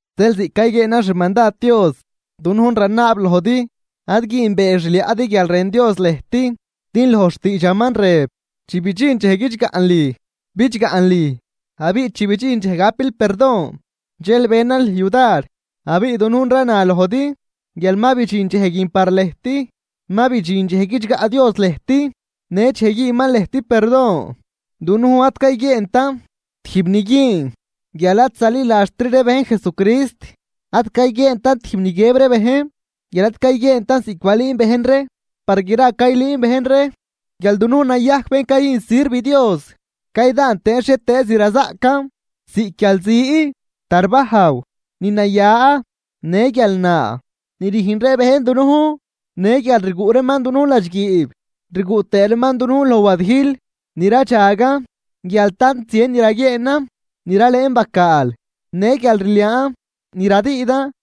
Zeel ziꞌc cayguieenan xmandad Dios, dunujn ranaab lojdi: Ad güünbee xliaꞌdi guial rën Dios lëjt. Din loj xtiidxaman rëb: Chi bidxin dxej guidxgaꞌn lüj, bidxgaꞌn lüj abiꞌ chi bidxin dxej gapil perdon dxel beenan lüj yudar. Abiꞌ dunujn rana lojdi guial ma bidxin dxej guin par lëjt, ma bidxin dxej guidxgaꞌ Dios lëjt në dxej güünman lëjt perdon. Dunujn ad cayguieentan tijb ni güün guial ad zaliladxtri ree bejn Jesucrist, ad cayguieentan tijb ni guiëb ree bejn guial ad cayguieentan ziꞌc balüün bejn ree. Par gra caylüün bejn ree guial dunujn nayajc bén cayüjn sirv Dios caydaan tëën xhietëëz ni razaꞌcan, ziꞌc guialzi, tarbajw, ni naya, në guial naa ni rüjn ree bejn dunujn. Në guial rguꞌ reeman dunujn ladxguiib, rguꞌ tëë reeman dunujn loj wadijl, ni radxagan guial tant zien ni raguieenan, ni ralëën bacaal, ne guialrliaan ni radüüdan.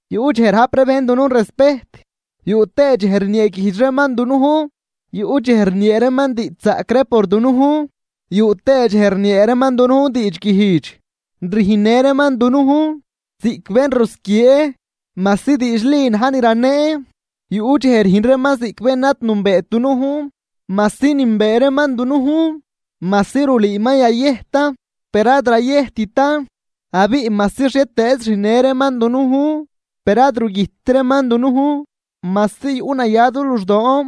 Yuꞌ dxej rajp ree bejn dunujn respejt, yuꞌ tëë dxej rnieeguijdx reeman dunujn. Yuꞌ dxej rniee reeman diidxzaꞌc ree por dunujn, yuꞌ tëë dxej rniee reeman dunujn diidxguijdx. Rüjnnë reeman dunujn ziꞌc bén rusquiee majsi diidxli na̱j ni raneen. Yuꞌ dxej rüjn reeman ziꞌc bén ad nünbeet dunujn, majsi nünbee reeman dunujn. Majsi rulüü ma yayëjtan per ad rayëjttan, abiꞌ majsi xhietëëz rüjnnë reeman dunujn per ad rugüjtt reeman dunujn. Majsi yuꞌ naya du luxdoon,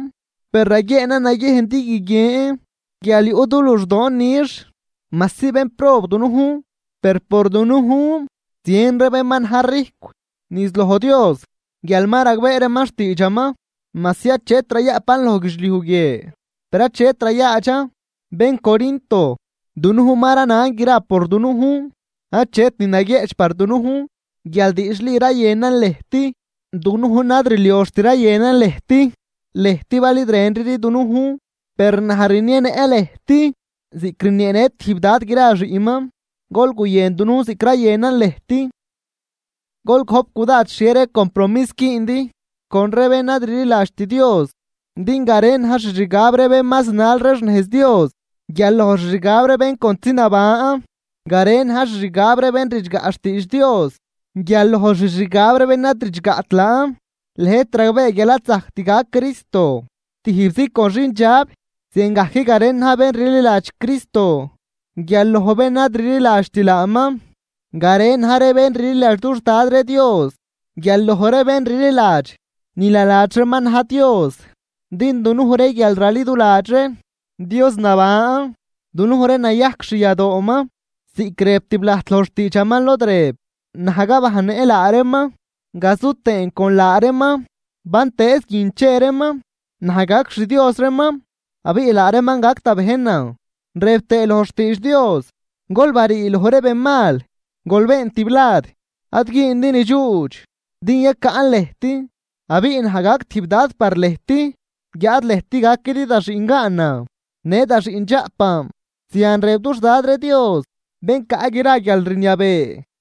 per raguieenan naguiejn din guiguien guial yuꞌ du luxdoon nix. Majsi bénprob dunujn per por dunujn zien ree bén ma na̱j rijcw niz loj Dios guial ma ragbee reeman xtiidxaman. Majsi achet rayaꞌpan loj guidxliuj guie, per achet rayaadxan. Bén Corinto, dunujn ma ranan gra por dunujn, achet ni naguieꞌch par dunujn guial diidxli rayënan lëjt. Dunujn ad rlioxt rayënan lëjt, lëjt bal id rënridi dunujn. Per naj rnienëꞌ lëjt ziꞌc rnieenë tijb dad gra xiꞌnman: Gol guyën dunujn ziꞌc rayënan lëjt. Gol gojp cudad xhie ree compromis güündi con ree bén ad rliladxt Dios, din garen na̱j xixgab ree bén ma zinal ree xnejz Dios guial loj xixgab ree bén contzi naban. Garen na̱j xixgab ree bén ridxgaꞌ xtiidx Dios guial loj xixgab ree bén ad ridxgaꞌt laan. Lëjt ragbee guial ad zajct gac Cristo tijbzi con xindxab, ziangajc garen na̱j bén rliladx Cristo guial loj bén ad rliladxt laaman. Garen na̱j ree bén rliladx dux Dad ree Dios guial loj ree bén rliladx ni naladx reeman na̱j dios. Din dunuj ree guial raliduladx ree Dios naban, dunuj ree nayajc xyadooman ziꞌc rëb tiblajt loj xtiidxaman lod rëb: Naj gabajnnëꞌ laa reeman gazu tëën con laa reeman bantëëz guin che reeman. Naj gac xDios reeman abiꞌ laa reeman gac da bejnan. Rëb tëë loj xtiidx Dios: Gol barii loj ree ben mal, gol been tiblad. Ad güündi ni dxuudx din yacaꞌn lëjt, abiꞌ naj gac tijb Dad par lëjt guiáad lëjt gaquidi da xiꞌngaanan në daxiꞌndxaꞌpan. Zian rëb dux Dad ree Dios bén caꞌ gra guialrniabee.